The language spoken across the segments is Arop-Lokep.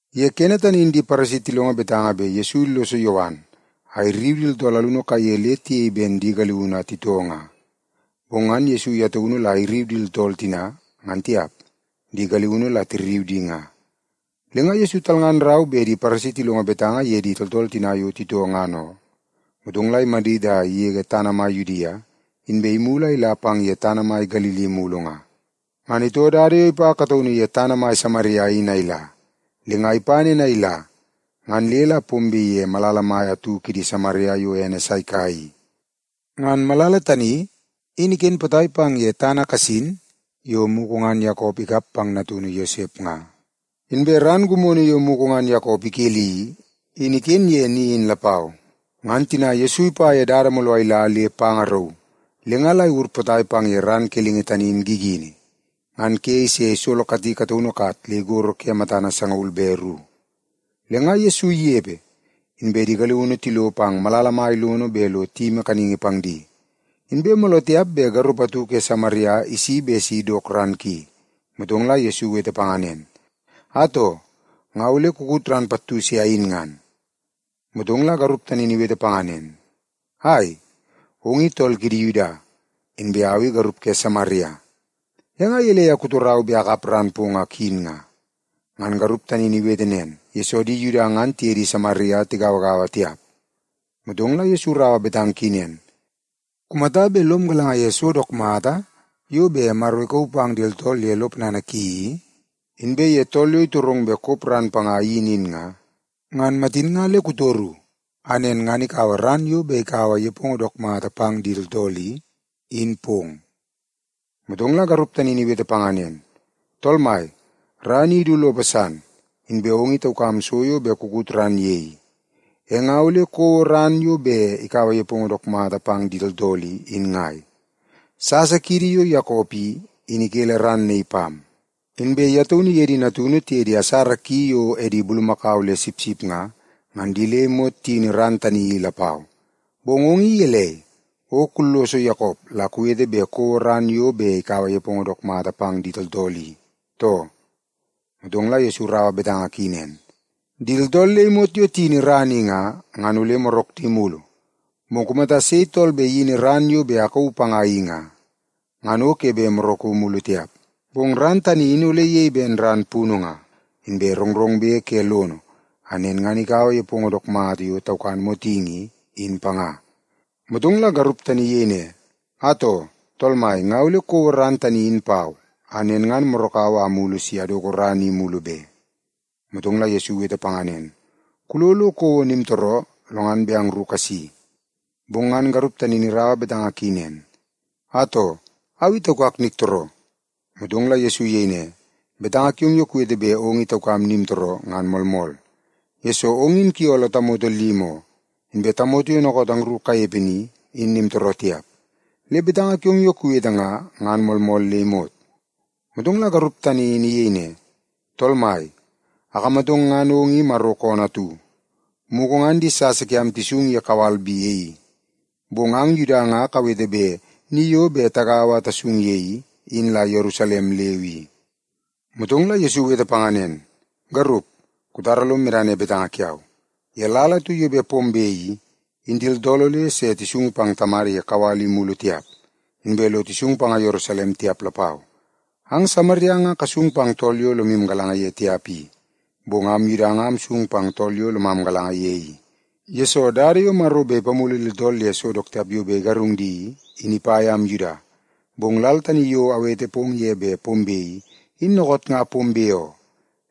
Ye kene tani in di Paresi tilongo betanga bet Yesu illoso Yowan a irriu di tooltool alunu kaiye le tiyei ben di galiunu a titoo nga. Bong ngan Yesu ye taunu la irriu di tooltool tina, ngan tiap, di galiunu la tirriu di nga. Le nga Yesu talngan rau bet di Paresi tilongo betanga ye di tooltool tina yo titoo ngan oo. Motong la imadit a igege tana mai Yudia, inbe imulu a ila pang tana mai Galili mulu nga. Ngan itoo dada yo ipa kataunu ye tana mai Samaria in a ila. Le nga ipa nen a ila, ngan le la pombe ye malala mai atu kidi Samaria yo ene Saika i. Ngan malala tani in iken potai pang ye tana kasin yo mugu ngan Yakop ikap pang natunu Yosep nga. Inbe ran gimono yo mugu ngan Yakop ikeli i, in iken ye ni tani lapau. Ngan tina Yesu ipa ye dada mooloo a ila le panga rauu, le nga la iwur potai pang ye ran kelingi tani in gigini. Ngan ke ise isolokati kataunu kat le igoro ke matana sangaul be ru. Le nga Yesu inepe, inbe di galiunu tilo pang malala mai lono bet lo tiyimi kaningi pang di. Inbe mooloo tiap bet garup atu ke Samaria isi bet si idok ran ki. Motong la Yesu iwete panga nen, “Atoo, nga ole kukut ran pattu se ayin ngan.” Motong la garup tani in iwete panga nen, “Ai, ong i tool kidi Yuda, inbe au i garup ke Samaria. E nga gelei a kutorau bet akut ran pong a kuyin nga?” (Ngan garup tani in iwete panga nen, yesoo di Yuda ngan tiye di Samaria tigauagaua tiap.) Motong la Yesu iraua betanga ki nen, “Kumata bet lom galanga ye so dook mata yo bet Maro ikauu pang di tooltool ye lo ponana ki i, inbe ye tool yo itorong bet kop ran panga a iyin in nga, ngan matin nga le kutoru a nen ngan ikaua ran yo bet ikaua nepongo dook mata pang di tooltool i, in pong.” Motong la garup tani in iwete panga nen, “Tool Mai, ran i idu lopo san, inbe ong i taukam so yo bet kukut ran ye i. E nga ole kouo ran yo bet ikaua nepongo dook mata pang di tooltool i, in ngai? Sasa kiidi yo Yakop i, in ikele ran naii pam. Inbe ye taunu iye di natunu tiye di asara ki yo edi bulumakau le sipsip nga, ngan di le imot tiyini ran tani i lapau. Bong ong i gelei, o kulloso Yakop la kuwete bet kouo ran yo bet ikaua nepongo dook mata pang di tooltool i, too?” Motong la Yesu iraua betanga ki nen, “Di tooltool le imot yo tiyini ran i nga, ngan ole morak di mulu. Bong kumata sei tool bet iyini ran yo bet akauu panga in nga, ngan o ke bet moraku mulu tiap. Bong ran tani in ole iyei ben ran punu nga, inbe rongrongbe ke lono, a nen ngan ikaua nepongo dook mata yo taukan motingi i, in panga.” Motong la garup tani iyei ne, “Atoo, Tool mai, nga ole kouo ran tani in pau, a nen ngan morakau a amulu si adoko ran i mulu be.” Motong la Yesu iwete panga nen, “Kulo lo kouo nimtooroo, lo ngan bet angru kasi.” Bong ngan garup tani in iraua betanga ki nen, “Atoo, au i taukak niktooroo.” Motong la Yesu iyei ne, “Betanga kiong yo kuwete bet ong i taukam nimtooroo, ngan moolmool. Yesoo, ong in kuyooloo tamoto limi oo, inbe tamoto yo dookoot angru kanepe ni, in nimtooroo tiap. Le betanga kiong yo kuwete nga, ngan moolmool le imot.” Motong la garup tani in iyei ne, “Tool mai, akamatong ngan ong i Maro koonoo atu. Mugu ngan di sasa kiam tisung ye kawal bi e i. Bong ang Yuda nga kawete bet ni yo bet tagaua a tasung ye i, in la Yerusalem leu i.” Motong la Yesu iwete panga nen, “Garup, kutara lom medana ye betanga kiau. Ye lal atu yo bet pombe i, in di tooltool ole se tisung pang Tamada ye kawal i mulu tiap, inbe lo tisung panga Yerusalem tiap lapau. Ang Samaria nga kasung pang tool yo lomu galanga ye tiap i. Bong am Yuda nga amsung pang tool yo lomam galanga ye i. Yesoo, dada yo Maro bet ipamulu di tooltool ye so dook tiap yo bet igarung di i, in ipa yam Yuda. Bong lal tani yo awete pong ye bet pombe i, in dookoot nga pombe oo.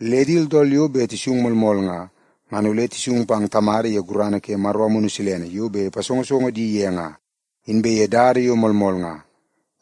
Le di tooltool yo bet tisung moolmool nga, ngan ole tisung pang Tamada ye gurana ke Maro Amunu yo bet ipasongosongo di ye nga, inbe ye dada yo moolmool nga.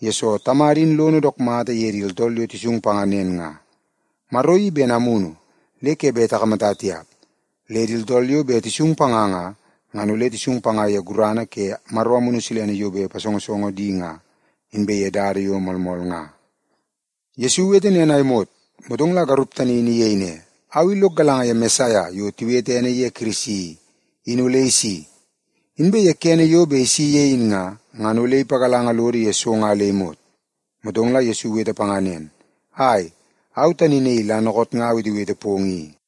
Yesoo, Tamada in lono dook mata ye di tooltool yo tisung panga nen nga. Maro i ben amunu le ke bet takamata tiap, le di tooltool yo bet tisung panga nga, ngan ole tisung panga ye gurana ke Maro Amunu yo bet ipasongosongo di nga, inbe ye dada yo moolmool nga.” Yesu iwete nen a imot, motong la garup tani in iyei ne, “Au i lok galanga ye Mesaia yo tiwete ene ye Kirisi i, in ole isi. Inbe ye kene yo bet isi ye in nga, ngan ole ipagalanga lodo ye so nga le imot.” Motong la Yesu iwete panga nen, “Ai, au tani naii la dookoot nga awetewete pong i.”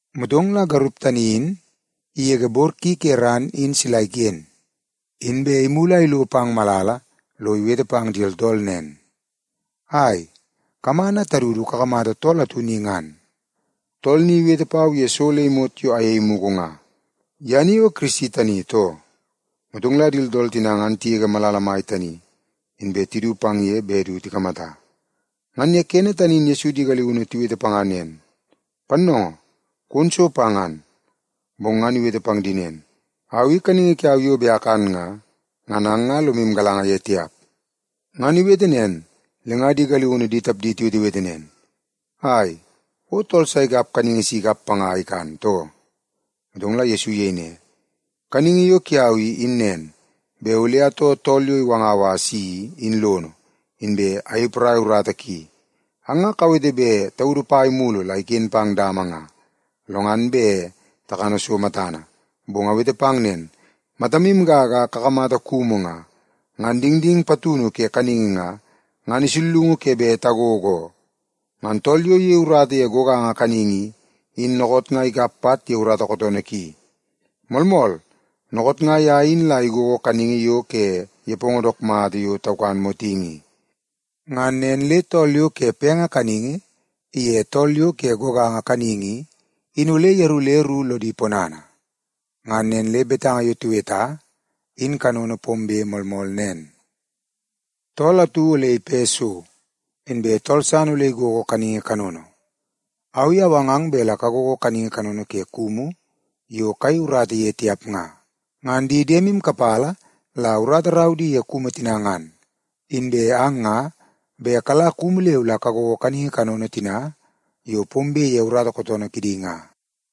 Motong la garup tani in igege bor ki ke ran in sila iken, inbe imulu a ilo pang malala lo iwete pang di tooltool nen, “Ai, kaman a tadu du kakamata tool atu ni ngan. Tool ni iwete pau ye so le imot yo ayei mugu nga. Ye ni o Kirisi tani, too?” Motong la di tooltool tina ngan tigege malala mai tani, inbe tidu pang ye bet du tikamata. Ngan ye kene tani in Yesu di galiunu tiwete panga nen, “Pannoongoo, kon so pa ngan.” Bong ngan iwete pang di nen, “Au i kaningi kiau yo bet akan nga, ngan ang nga lomu galanga ye tiap.” Ngan iwete nen, le nga di galiunu di tapdi tiwetewete nen, “Ai, o tool sa ikap kaningi si ikap panga a ikan, too?” Motong la Yesu iyei ne, “Kaningi yo kiau i, in nen, bet ole atoo tool yo iwangau a asi, in lono, inbe ayei porai urata ki. Ang nga kawete bet taudu pai mulu la iken pang dama nga, lo ngan bet takana so matana. Bong awete pang nen, matamu gaga a kakamata kumu nga, ngan dingding patunu ke kaningi nga, ngan isullungu ke bet tagogo oo. Ngan tool yo iyei urata ye goganga kaningi i, in dookoot nga ikap pat ye urata kootoonoo ki. Moolmool, dookoot nga ye in la igogo kaningi yo ke nepongo dook mata yo taukan motingi i. Ngan nen le tool yo ke penge kaningi in iye tool yo ke goganga kaningi i, in ole yeru le ru bet lodi ponana. Ngan nen le betanga yo tiweta in kanono pombe moolmool nen, ‘Tool atu ole ipe so, inbe tool san ole igogo kaningi kanono.’ Au i awangang bet la kagogo kaningi kanono ke kumu yo kayei urata ye tiap nga. Ngan di diemu kapala la urata rau di ye kumu tina ngan, inbe ang nga bet kala kumu leu la kagogo kaningi kanono tina yo pombe ye urata kootoonoo kidi nga.”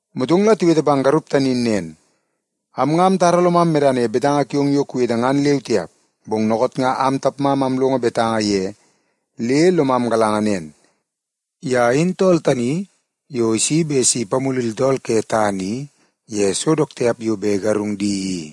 Motong la tiwete pang garup tani in nen, “Am nga amtara lomam medana ye betanga kiong yo kuwete ngan leu tiap. Bong dookoot nga am tapmam amlongo betanga ye le lomam galanga nen: Ye in tool tani yo isi bet si ipamulu di tooltool ke tana i ye so dook tiap yo bet igarung di i.”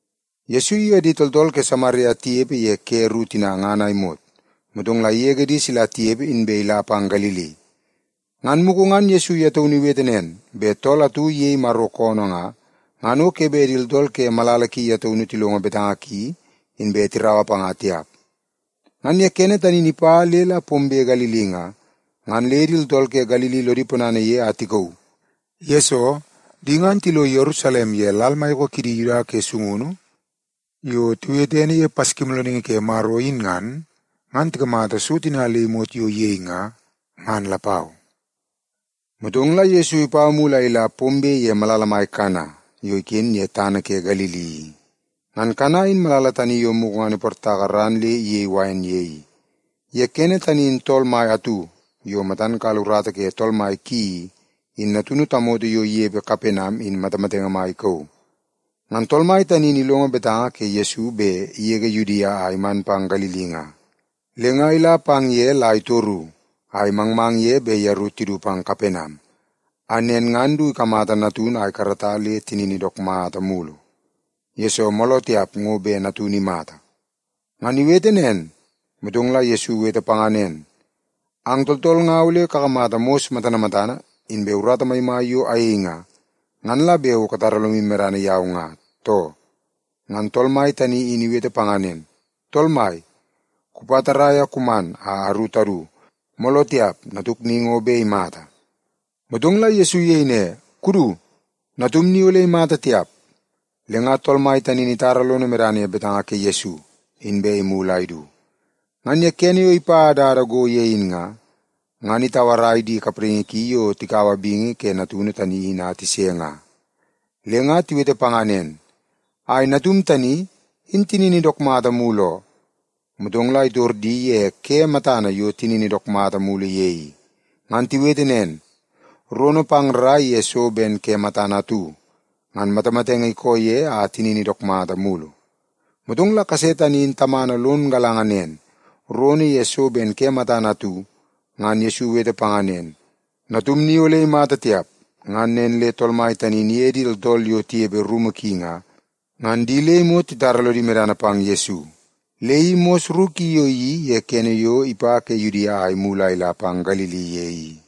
Yesu iye di tooltool ke Samaria tinepe ye ke ru tina ngan a imot, motong la igege di sila tinepe inbe ila pang Galili. (Ngan mugu ngan Yesu ye taunu iwete nen, bet tool atu iyei Maro koonoo nga, ngan o ke bet di tooltool ke malala ki ye taunu tilongo betanga ki inbe tiraua panga tiap.) Ngan ye kene tani in ipa le la pombe Galili nga, ngan le di tooltool ke Galili lodi ponana ye a tikauu. Yesoo, di ngan tilo Yerusalem ye lal maiyoko kidi Yuda ke sungunu yo tiwete ene ye Paskimoolooningi ke Maro in nga, ngan tikamata so tina le imot yo iyei nga, ngan lapau. Motong la Yesu ipa mulu a ila pombe ye malala mai Kana yo iken ye tana ke Galili i. Ngan Kana in malala tani yo mugu ngan iportaka ran le iyei wain ye i. Ye kene tani in tool mai atu yo matan kala urata ke tool kuto mai ki i, in natunu tamoto yo inepe Kapenam in matamatenge mai ikauu. Ngan tool mai tani in ilongo betanga ke Yesu bet igege Yudia a iman pang Galili nga, le nga ila pang ye la itoru a imangmang ye bet yeru tidu pang Kapenam, a nen ngan du ikamata natunu a ikarata le tinini dook mata mulu. Yesoo, mooloo tiap ngo bet natunu tani imata. Ngan iwete nen, motong la Yesu iwete panga nen, “Ang tooltool nga ole kakamata mos matana matana inbe urata maimai yo ayei nga, ngan la bet o katara lomu medana yau nga, too?” Ngan tool mai tani in iwete panga nen, “Tool mai, kupa tarrai a kuman a aru tadu, mooloo tiap natuk ni ngo bet imata.” Motong la Yesu iyei ne, “Kudu. Natum ni ole imata tiap.” Le nga tool mai tani in itara lono medana ye betanga ke Yesu, inbe imulu a idu. Ngan ye kene yo ipa dada go ye in nga, ngan itauarai di kapraingi ki yo tikaua bingi ke natunu tani in a tise nga. Le nga tiwete panga nen, “Ai, natum tani, in tinini dook mata mulu oo.” Motong la itor di ye ke matana yo tinini dook mata mulu ye i. Ngan tiwete nen, “Rono pang rrai ye so ben ke matana atu, ngan matamatenge ikoo ye a tinini dook mata mulu.” Motong la kase tani in tamana lon galanga nen, rono ye so ben ke matana atu, ngan Yesu iwete panga nen, “Natum ni ole imata tiap.” Ngan nen le tool mai tani in iye di tooltool yo tinepe rumu ki nga, ngan di le imot titara lodi medana pang Yesu. Le i mos ru ki yo iyeii ye kene yo ipa ke Yudia a imulu a ila Galili ye i.